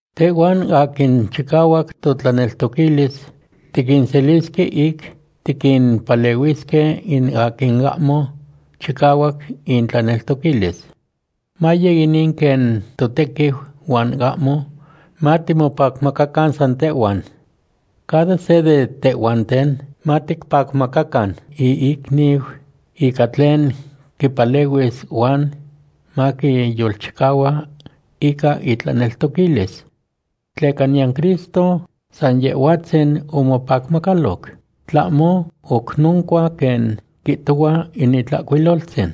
Tehhuan aquin chicahuac totlaneltoquilis tiquinselisque ic tiquimpalehuisque in aquin ahmo chicahuac intlaneltoquilis. Maye inin quen totequiu huan ahmo matimopacmacacan san tehhuan. Cada se de tehhuanten maticpacmacacan iicniu ica tlen quipalehuis huan maquiyolchicahua ica itlaneltoquilis. Tleca niyan Cristo san Yehhuatzin omopacmacaloc, tlahmo oc noncua quen quihtohua in Itlahcuiloltzin: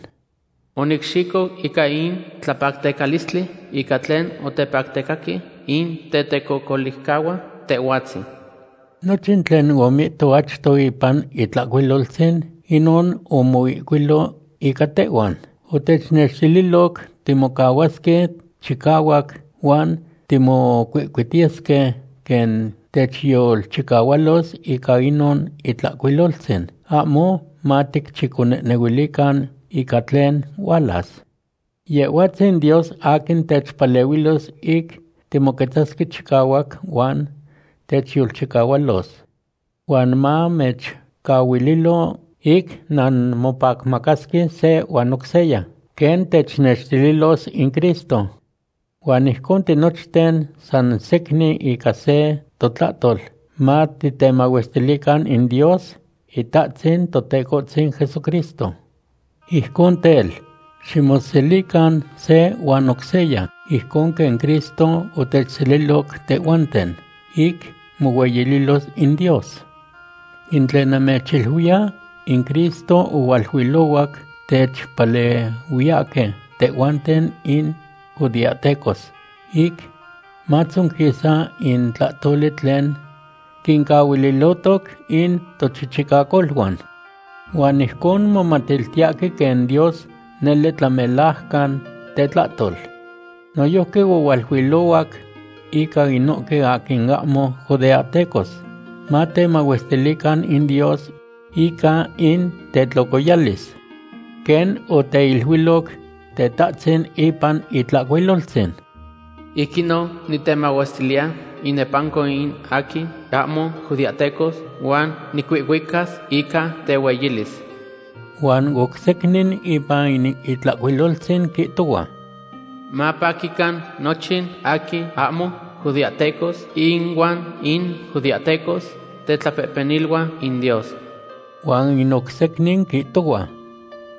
“Onicxico ica in tlapactecalistli ica tlen otepactecaque in tecocolihcahuan Tehhuatzin.” Nochin tlen omihto achto ipan Itlahcuiloltzin, inon omoihcuilo ica tehhuan. Otechnextililoc timocahuasque chicahuac huan timocuihcuitiyesque quen techyolchicahualos ica inon Itlahcuiloltzin, ahmo maticchiconehnehuilican ica tlen hualas. Yehhuatzin Dios aquin techpalehuilos ic timoquetzasque chicahuac huan techyolchicahualos. Huan mamechcahuililo ic nanmopacmacasque se huan oc seya, quen technextililos in Cristo. Huan ijcon tinochten san secnin ica se totlahtol matitemahuestilican in Dios Itahtzin Totecohtzin Jesucristo. Ijcon tel, ximoselican se huan oc seya, ijcon quen Cristo otechseliloc tehhuanten, ic mohueyililos in Dios. In tlen namechiluiya, in Cristo ohualuilohuac techpalehuiyahque tehhuanten in judeahtecos ic matzonquisa in tlahtoli tlen quincaquiltilotoc in tochichicacoluan. Huan ijcon momatiltiyahque quen Dios nele tlamelajcan tetlahtol. Noyojqui ohualuilohuac ica inohque aquin ahmo judeahtecos, matemahuestilican in Dios ica in tetlocoyalis. Quen oteiluiloc Tetahtzin ipan Itlahcuiloltzin: Ic inon nitemahuestiliya inepanco in aquin ahmo judeahtecos, huan nicuihcuicas ica tehueyilis. Huan oc secnin ipan in Itlahcuiloltzin quihtohua: Mapaquican nochin aquin ahmo judeahtecos ihuan in judeahtecos, tetlapehpeniluan in Dios. Huan in oc secnin quihtohua: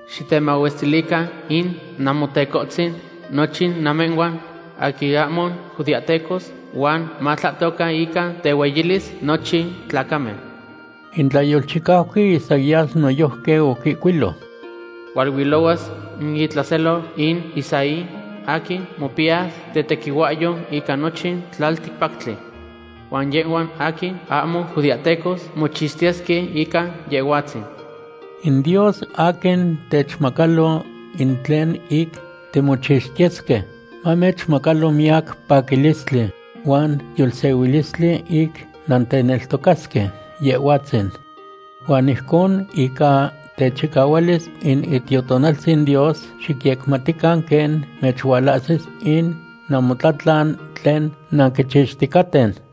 Xitemahuestilican in Namotecohtzin, nochin namehhuan aquin ahmo judeahtecos, huan matlahtocan ica tehueyilis nochin tlacamen. In tlayolchicauqui Isaías noyojqui oquihcuilo: Hualuilohuas in itlaselo in Isaí, aquin mopiyas tetequihuahyou ica nochin tlalticpactli. Huan yehhuan aquin ahmo judeahtecos mochixtiyesque ica Yehhuatzin. In Dios aquin techmacalo in tlen ic timochixtiyesque, mamechmacalo miyac paquilistli huan yolsehuilistli ic nanteneltocasque Yehhuatzin. Huan ijcon ica techicahualis in Itiotonaltzin Dios xicyecmatican quen mechualahsis in namotlatlan tlen nanquichixticaten.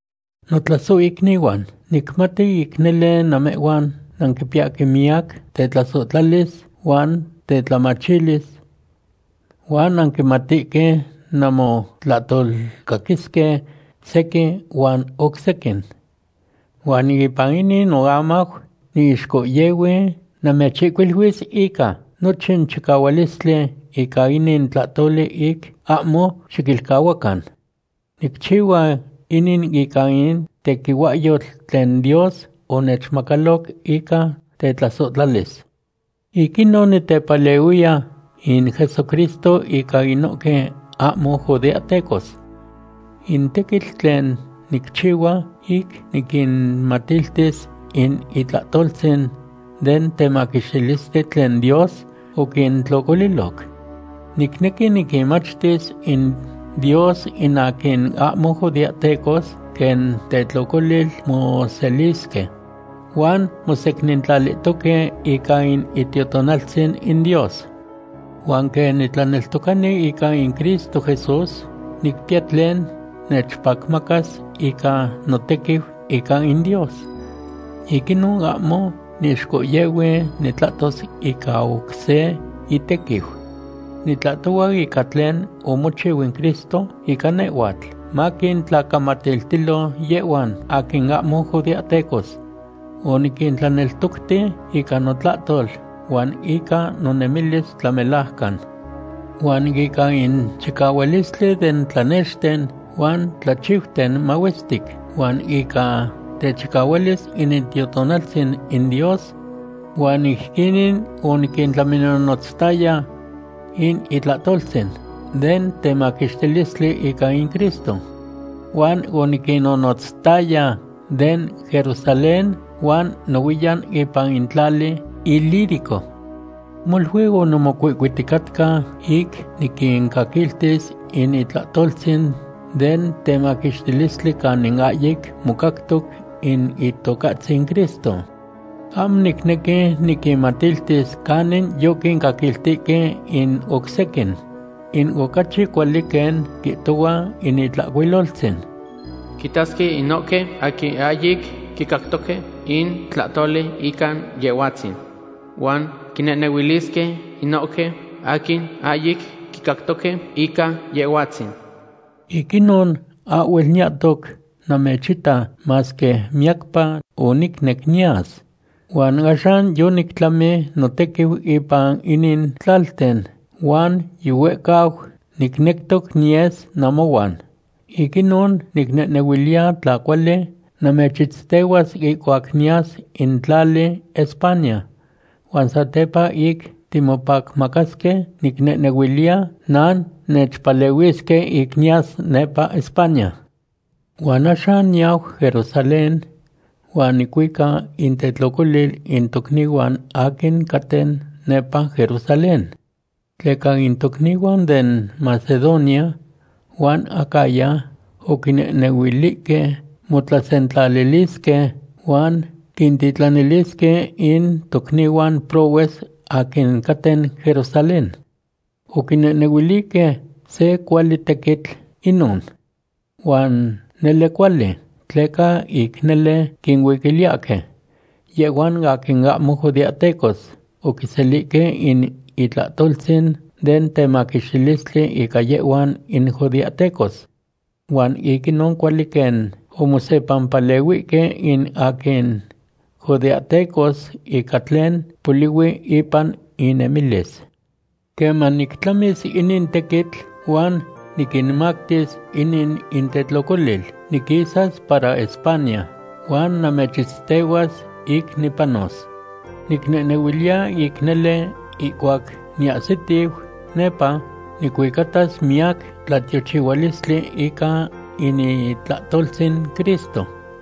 Notlasohicnihuan, nicmati ic nele namehhuan nanquipiyahque miyac tetlasohtlalis huan tetlamachilis. Huan nanquimatihque nanmotlahtolcaquisque sequin huan oc sequin. Huan ipan inin noamau niixcohyehui namechihcuiluis ica nochin chicahualistli ica inin tlahtoli ic ahmo xiquilcahuacan. Nicchihua inin ica in tequihuahyotl tlen Dios onechmacaloc ica tetlasohtlalis. Ic inon nitepalehui in Jesucristo ica inohque ahmo judeahtecos. In tequitl tlen nicchihua ic niquinmatiltis in itlahtoltzin den temaquixtilistli tlen Dios oquintlocoliloc. Nicnequi niquinmachtis in Dios in aquin ahmo judeahtecos quen tetlocolil moselisque, huan mosecnintlalihtoque ica in Itiotonaltzin in Dios. Huan quen nitlaneltocani ica in Cristo Jesús, nicpiya tlen nechpacmacas ica notequiu ica in Dios. Ic inon ahmo niixcohyehui nitlahtos ica oc se itequiu. Nitlahtohua ica tlen omochiu in Cristo ica nehhuatl, maquintlacamatiltilo yehhuan aquin ahmo judeahtecos. Oniquintlaneltocti ica notlahtol huan ica nonemilis tlamelajcan, huan ica in chicahualistli den tlanexten huan tlachiuten mahuestic, huan ica techicahualis in Itiotonaltzin in Dios. Huan ijquinin oniquintlaminonotztaya in itlahtoltzin den temaquixtilistli ica in Cristo. Huan oniquinnonotztaya den Jerusalén huan nohuiyan ipan in tlali Ilírico. Molui onimocuihcuiticatca ic niquincaquiltis in itlahtoltzin den temaquixtilistli canin ahyic mocactoc in Itocahtzin Cristo. Ahmo nicnequi niquinmatiltis canin yoquincaquiltihque in oc sequin. In ocachi cuali quen quihtohua in Itlahcuiloltzin: Quitasque inohque aquin ahyic quicactoque in tlahtoli ica Yehhuatzin. Huan quinehnehuilisque inohque aquin ahyic quicactoque ica Yehhuatzin. Ic inon ahhuel niyahtoc namechita, masque miyacpa onicnec niyas. Huan axan yonictlami notequiu ipan inin tlalten, huan yihuehcau nicnectoc niyes namohuan. Ic inon nicnehnehuiliya tla cuali namechitztehuas ihcuac niyas in tlali España. Huan satepa ic timopacmacasque, nicnehnehuiliya nannechpalehuisque ic niyas nepa España. Huan axan niyau Jerusalén huan nicuica intetlocolil in tocnihuan aquin caten nepa Jerusalén. Tleca in tocnihuan den Macedonia huan Acaya oquinehnehuilihque motlasentlalilisque huan quintitlanilisque in tocnihuan prohues aquin caten Jerusalén. Oquinehnehuilihque se cuali tequitl inon. Huan nele cuali, tleca ic nele quinuiquiliyahque. Yehhuan aquin ahmo judeahtecos oquiselihque in itlahtoltzin den temaquixtilistli ica yehhuan in judeahtecos. Huan ic inon cuali quen omosepampalehuihque in aquin judeahtecos ica tlen polihui ipan inemilis. Queman nictlamis inin tequitl huan niquinmactis inin intetlocolil, niquisas para España, huan namechitztehuas ic nipanos. Nicnehnehuiliya ic nele ihcuac niahsitiu nepa, nicuicatas miyac tlatiochihualistli ica in itlahtoltzin Cristo.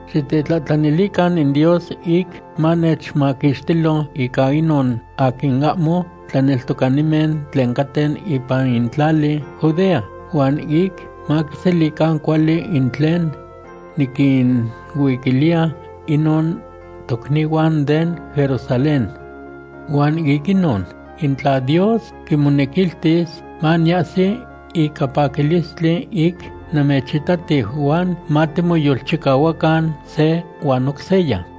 Xitetlahtlanilican in Dios ic manechmaquixtilo ica inon aquin ahmo tlaneltocanimen tlen caten ipan in tlali Judea, huan ic maquiselican cuali in tlen niquinuiquiliya inon tocnihuan den Jerusalén. Huan ic inon, in tla Dios quimonequiltis, maniyahsi ica paquilistli ic namechitatiu huan matimoyolchicahuacan se huan oc seya.